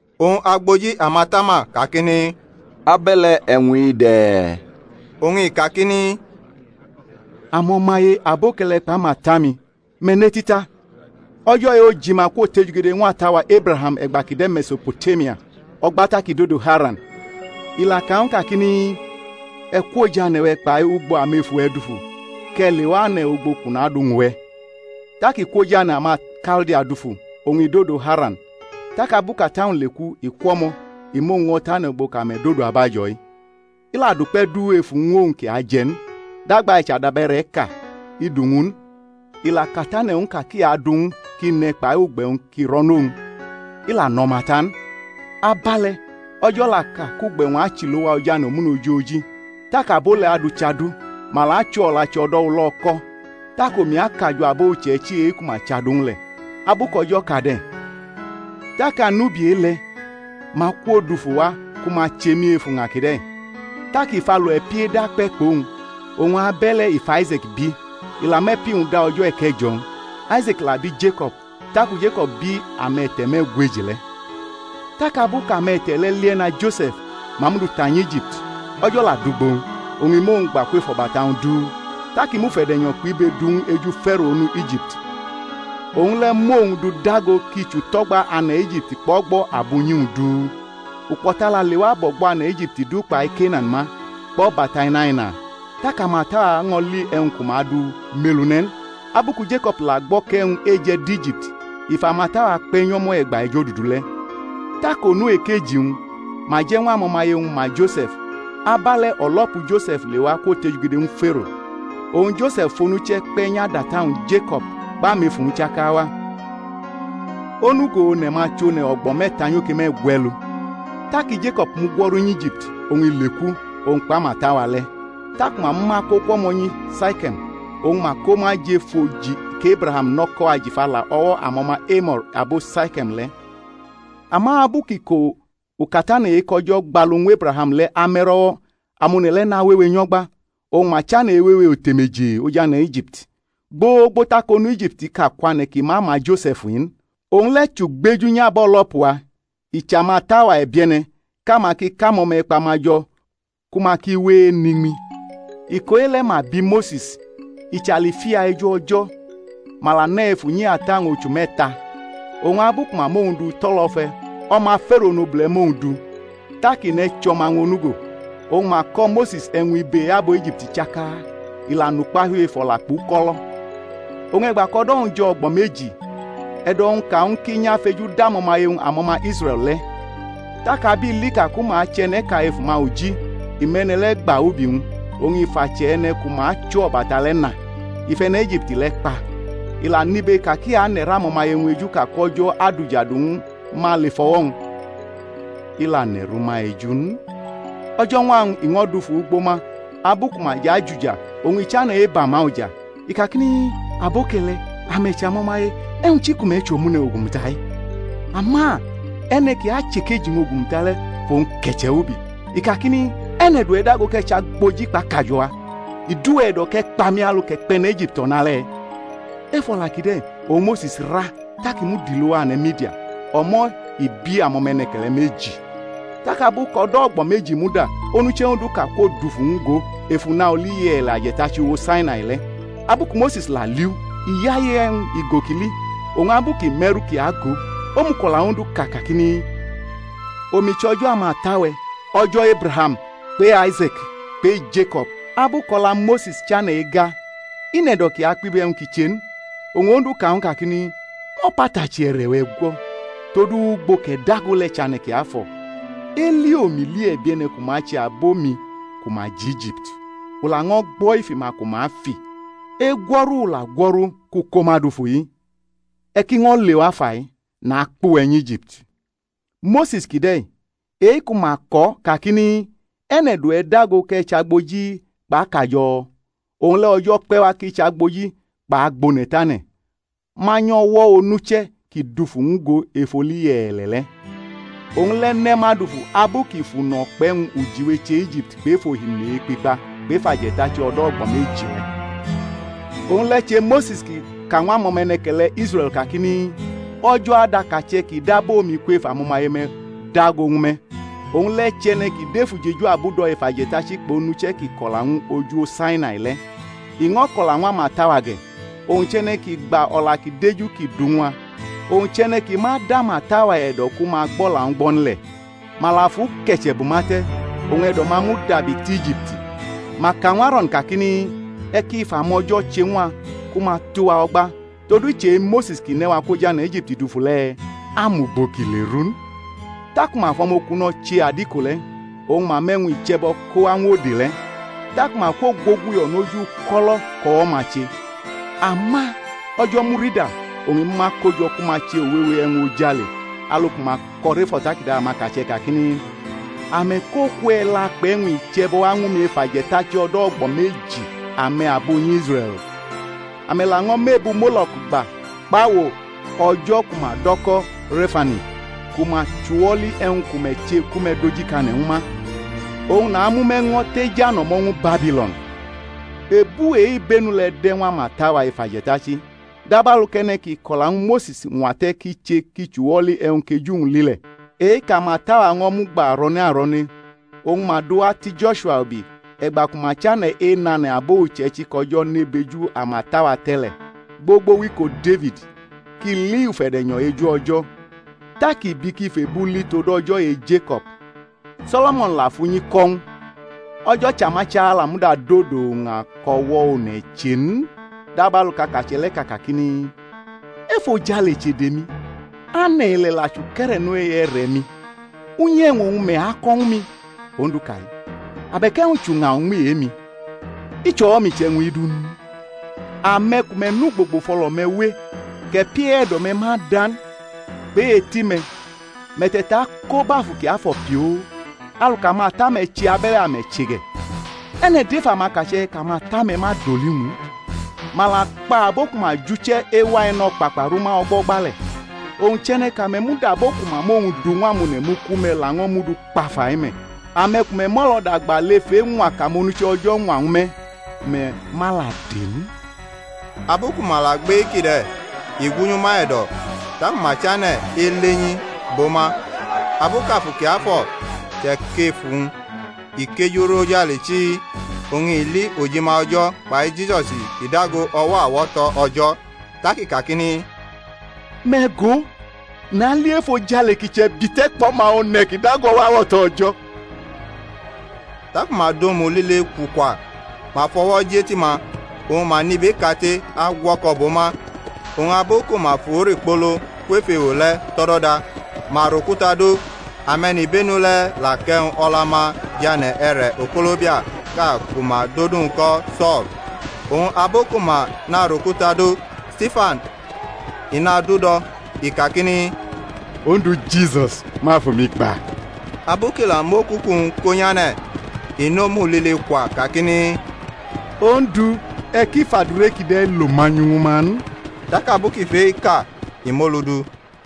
Oñ agboji amatama kakini, Abe̩le̩ e̩wñ-i de̩? Oñ i kakini, Amo̩-maye aboke̩le̩ kpʼamata-mi, me̩ neti ta. O̩jo̩ e-ojima kwotejugede ñw ata-wa Ebraham e̩gba kʼi de̩ Me̩so̩potemia, o̩gba tak i dodo Haran. I la ka ñw u kakini, E̩ kwʼoj ane̩-we̩ kpai ugbo amefu-we̩ dufu, kʼe̩ lewa ane̩ ugbo kʼu naduñʼuwe̩. Tak i kwʼoj ane̩ amaKaldia dufu, oñ i dodo Haran. Tak abu kʼata-wñ leku i kwʼo̩mo̩ i mʼowñ ño̩ tʼane̩ ugbo kʼame̩ dodo abajo̩-i. I la dʼukpe̩ du ef uwñ ñw owñ kʼi aje̩ n, dagba i chʼadabe̩re̩ʼka i du ñw u n. I la katane̩ ñw u ka kʼi adʼu ñw u kʼi ne̩ kpai ugbe̩-wñ ki ro̩nʼowñ. I la nʼo̩ma ta n. Abe̩le̩ O̩jo̩ la ka kʼugbe̩-wñ achʼilo̩wa oj ane̩ omune̩ ojoji, tak abo le̩ adʼu chʼadu, ma la achʼo o̩lachi o̩do̩ ulo̩ko̩. Tak omi akajo̩ abo uche̩ichi e-ku ma chʼadu-wñ le̩, abu kʼO̩jo̩ ka de̩. Tak anubi e-le̩ ma akwo dufu wa ku ma che mi ef uña kide̩. Tak i fʼalo e̩pi eda kpe̩ kpʼowñ. Oñ abe̩le̩ i fʼAise̩k bi i la mʼe̩pi-wñ da o̩jo̩ e̩ke̩jo̩-wñ. Aise̩k la bi Jeko̩b. Taku Jeko̩b bi ame̩te̩ me̩gweji le̩. Tak abu kʼame̩te̩ le̩ lie̩na Jose̩f ma mʼu du ta nyʼIjipti. O̩jo̩ la dʼugbo-wñ. Oñ i mʼowñ gba kwef o̩bata-wñ du. Tak i mʼufe̩de̩nyo̩ kpʼibe du ñw u eju Fero onu Ijipti. Owñ le̩ mʼowñ du dago kʼi chʼuto̩gba ane̩ Ijipti kpʼo̩gbo̩ abunyi-wñ du. Ukpo̩ta la lewa bʼo̩gbo̩ ane̩ Ijipti du kpai Kenan ma, kpʼo̩bata inaina. Tak amata-wa ño̩ li e̩wñ ku ma du mʼelu ne̩ n. Abu ku Jeko̩b la gbo̩ kʼe̩wñ eje̩ dʼIjipti, i fʼamata-wa kpe̩ nyʼo̩mo̩ e̩gba ejodudu le̩. Tak onu ekeji-wñ ma je̩ ñw amo̩maye-wñ ma Jose̩f. Abe̩le̩ o̩lo̩pu Jose̩f lewa kwotejugede ñw Fero. Oñ Jose̩f fʼonuche̩ kpe̩ nyʼadʼata-wñ Jeko̩b kpʼamefu-wñ chaka wa. Onugo one̩-ma chʼone̩ o̩gbo̩ me̩ta nyoke me̩gwe̩lu. Taki Jeko̩b mugwo̩ru nyʼIjipti, oñ i leku, owñ kpʼamata-wa le̩. Taku ma mʼuma ko kwʼo̩mo̩ nyi Saike̩m, oñ ma ko ma jʼef oji kʼEbraham nʼo̩ko̩ ajifa la o̩wo̩ amo̩ma Emo̩r, abo Saike̩m le̩. Ama abu kʼiko ukatane̩ e-kʼO̩jo̩ gbalu ñw Ebraham le̩ ame̩rʼo̩wo̩ amone̩ le̩ nawewe nyʼo̩gba, oñ ma chane̩ ewewe otemeje ojane̩ Ijipti. Gbogbo tak onu Ijiptiʼka kwane̩ kʼi ma ma Jose̩f in. Owñ le̩ chʼugbeju nyʼabo̩lo̩pu-wa, i chʼamata-wa e̩bie̩ne̩ kʼama ki kʼamo̩me̩kpa-ma jo̩ ku ma ki we enʼiñmi. Iko e-le̩ ma bi Mose̩s. I chʼalifia eju O̩jo̩. Ma la nʼe̩ ef unyi ata-wñ ochu me̩ta. Oñ abu ku ma mʼowñ du tʼo̩lo̩fe̩ o̩ma Fero onobule̩ mʼowñ du, tak i nʼe̩ chʼo̩ma-wñ onugo. Oñ ma ko̩ Mose̩s e̩wñ ibe e-abo Ijipti chaka. I la nʼukpahiu ef o̩la kpʼuko̩lo̩. Oñ e̩gba kʼo̩do̩-wñ jo̩ o̩gbo̩ meji, e̩do̩-wñ ka ñw u kʼi nyʼafejudʼamo̩maye-wñ amo̩ma Israe̩l le̩. Tak ab i li ka ku ma achʼe̩ne̩ʼka ef uma uji i mʼe̩ne̩ le̩ gba ubi-wñ, oñ i fʼache̩ e̩ne̩ ku ma achʼo o̩bata le̩ na. I fʼe̩ne̩ Ijipti le̩ kpa. I la nʼibe ka ki ane̩rʼamo̩maye-wñ eju ka kʼO̩jo̩ adʼujadu ñw ma lef o̩wo̩-wñ. I la ne̩rʼuma eju n. O̩jo̩ñwa-wñ i ño̩ dufu ugbo ma ahu ku ma jʼajuja oñ i chane̩ eba ma uja. I kakini, Aboke̩le̩, ame̩ chʼo̩maye, e̩wñ chi ku me̩ chʼomune̩ o̩gu-muta-i? Ama e̩ne̩ ki achʼekeji-wñ ogumuta le̩ fʼowñ ke̩che̩ wʼubi, i kakini, E̩ne̩ dʼuwe̩ dago kʼe̩ chʼagboji kpʼakajo̩-wa? I dʼuwe̩ e̩do̩ kʼe̩ kpa mi alu kʼe̩ kpʼe̩ne̩ Ijipti o̩nale̩? Ef o̩la kide̩ oñ Mose̩s ra, tak i mud ilowa ane̩ Midian. O̩mo̩ i bi amo̩me̩ne̩ke̩le̩ meji. Tak abu kʼodo̩ o̩gbo̩ meji muda onuche̩ Onduʼka kwo dufu ñw u go ef una oli ye̩e̩le̩ aje̩tachi uwo Sainai le̩. Abu ku Mose̩s la liʼu, i yaye e̩wñ igo kʼi li. Oñ abu kʼi me̩rʼu kʼi agʼo, omuko̩la Ondu ka kakini, Omi chʼO̩jo̩ amata-we̩, O̩jo̩ Ebraham kpʼe-Aise̩k kpʼe-Jeko̩b. Abu kʼo̩la Mose̩s chane̩ ega i nʼe̩do̩ kʼi akpibe e̩wñ ki che n. Oñ Ondu ka ñw u kakini, Mʼo̩patachi e̩re̩-we̩ gwo̩, todu ugbo kʼe̩ dago le̩ chʼane̩ kiafo̩. Eli omi li e̩bie̩ne̩ ku ma ache abo-mi ku ma jʼIjipti. U laño̩ gbo̩ ifi-ma ku ma fi. Egwo̩ni u la gwo̩ru kʼu ko ma dufu-i. E̩ ki ño̩ lewa fai, nakpʼuwe̩ nyʼIjipti. Mose̩s kide̩-i e-ku ma ko̩ kakini, E̩ne̩ dʼuwe̩ dago kʼe̩ chʼagboji kpʼakajo̩? Owñ le̩ O̩jo̩ kpe̩ wa kʼi chʼagboji kpʼagbone̩tane̩, manyʼo̩wo̩ onuche̩ kʼi dufu ñw u go ef oli ye̩e̩le̩ le̩. Owñ le̩ ne̩ ma dufu abu kʼi fʼuno̩ kpʼe̩wñ ujiwe che Ijipti kpʼef Ohimini Ekpikpa kpʼef aje̩tachi o̩do̩ o̩gbo̩ meji le̩. Owñ le̩ che Mose̩s ki ka ñw amo̩me̩ne̩ke̩le̩ Israe̩l kakini, O̩jo̩ adʼakache̩ kʼi dab omi kwef amo̩maye-me̩ dago ñw me̩. Owñ le̩ chʼe̩ne̩ kʼi dʼef ujeju abudo̩ ef aje̩tachi kpʼonuche̩ kʼi ko̩la ñw u oj uwo Sainai le̩, i ño̩ ko̩la ñw amata-wa ge̩. Owñ chʼe̩ne̩ ki gba o̩la ki deju kʼi du ñw a. Owñ chʼe̩ne̩ ki ma dʼamata-wa e̩do̩ ku ma gbʼo̩la-wñ gbo̩ n le̩. Ma la fʼu ke̩che̩ bʼuma te̩, oñ e̩do̩-ma mudabi tʼIjipti. Ma ka ñw Aro̩n kakini, E̩ ki fʼamo̩jo̩ che ñw a ku ma atʼuwa o̩gba; todu i chʼe-Mose̩s kʼi ne̩ wa kwʼoj ane̩ Ijipti dufu le̩, a mʼugbo kʼi leru n. Taku ma fʼo̩mokuno̩ che adiko le̩, oñ ma mʼe̩wñ iche̩bo̩ ko wa ñw ode le̩. Taku ma kwogwoguyo̩ noj uko̩lo̩ kʼo̩wo̩-ma che. Ama O̩jo̩ murida, oñ i mʼuma ko jo̩ ku ma che uwewe e̩wñ ojale, alu ku ma ko̩ rʼef o̩takada amakache̩ kakini, Ame̩ kʼoku e̩la kpʼe̩wñ iche̩bo̩ wa ñw mi ef aje̩tachi o̩do̩ o̩gbo̩ meji, ame̩ abunyi Israe̩l? Ame̩ laño̩ mʼebu Molo̩k gba, kpʼawo o̩jo̩ ku ma do̩ ko̩ Re̩fani, ku ma chʼuwo̩li e̩wñ ku me̩ che ku me̩ dojikane̩ ñw ma; oñ namʼume̩ ño̩ tej ano̩mo̩ ñwu Babilo̩n. Ebu e-ibenu le̩ de̩ ñw amata-wa ef aje̩tachi, dabalu kʼe̩ne̩ ki ko̩la ñw Mose̩s ñwa te̩ kʼi che kʼi chʼuwoli e̩wñ kʼeju-wñ li le̩, e-kʼamata-wa ño̩ mugba arone aro̩ne oñ ma dʼu wa ti Jo̩shua ubi e̩gba ku ma chane̩ enʼane̩ abo uche̩ichi kʼO̩jo̩ ne bʼeju amata-wa te̩ le̩, gbogbo wʼiko Defid kʼi li ufe̩de̩nyo̩ eju O̩jo̩, tak i bi kʼi fʼebu li tod O̩jo̩ e-Jeko̩b. So̩lo̩mo̩n la fʼunyi ko̩ ñw u. O̩jo̩ Chamachala muda dodo uña kʼo̩wo̩ one̩ che n, dabalu kʼakache̩ le̩ ka kakini, Efojale chʼede-mi, ane̩ ile̩ la chʼuke̩re̩no e-e̩re̩-mi; unyi e̩wñ oñ me̩ ako̩ ñw mi? Ondu ka-i, abe̩k e̩wñ chʼuña uñmi e-mi? I chʼo̩wo̩-mi chʼe̩wñ-i du n? Ame̩ ku me̩ nʼugbogbo fʼo̩lo̩-me̩ we, kʼe̩pi e-e̩do̩-me̩ ma da n, kpʼe-eti-me̩, me̩ te̩tako bʼAfu Kiafo̩ pioo. Alu kʼamata-me̩ che abe̩le̩ ame̩ che ge̩. E̩ne̩ dʼef amakache̩ kʼamata-me̩ ma doli-wñ n? Ma la kpa abo ku ma jʼuche̩ ewa E̩no̩kpakpa rʼuma o̩gbo̩gba le̩. Owñ chʼe̩ne̩ kʼame̩ mud abo ku ma mʼowñ du ñw amone̩ mu ku me̩ laño̩ dʼu kpa fai me̩! Ame̩ ku me̩ mʼo̩lo̩da gba lef eñwa kʼamonuche̩ O̩jo̩ ñwa ñw me̩, ku me̩ ma la de n. Abu ku ma la gbʼe-kide̩ i gwunyʼuma e̩do̩, taku ma chane̩ elenyi bʼo ma. Abu kʼAfu Kiafo̩ che̩kʼef uwñ i kejurʼojale chii, oñ i li ojima O̩jo̩ kpai Jisusi kʼi dago o̩wo̩ awo̩to̩ O̩jo̩. Tak i kakini, Me̩ go, nali efojale ki chʼe̩bite̩ kpʼO̩ma O̩ne̩ kʼi dago o̩wo̩ awo̩to̩ O̩jo̩. Taku ma dʼomu lile kwukwa, ma fʼo̩wo̩ jʼeti-ma, oñ ma nʼibeʼkate agwo̩ko̩ bʼo ma. Oñ abu ku ma fʼu rikpolo kwef ewo le̩ tʼo̩do̩da, ma rʼokuta dʼo̩; ame̩nibenu le̩ʼ la kʼe̩wñ o̩la-ma jʼane̩ e̩re̩ o̩ko̩lobiaʼka ku ma dʼodu-wñ ko̩ So̩l. Oñ abu ku ma narʼokuta do Stifan i nadu-do̩, i kakini, Ondu Jisus, mʼafu-mi gba. Abu kʼi la mʼokuku-wñ ko̩ nyʼane̩, i nʼomu lile kwa kakini, Ondu, e̩ ki fʼadure kide̩ lo manyu ñwu ma n. Tak abu kʼi fʼe-kide̩ ka i mʼolu du.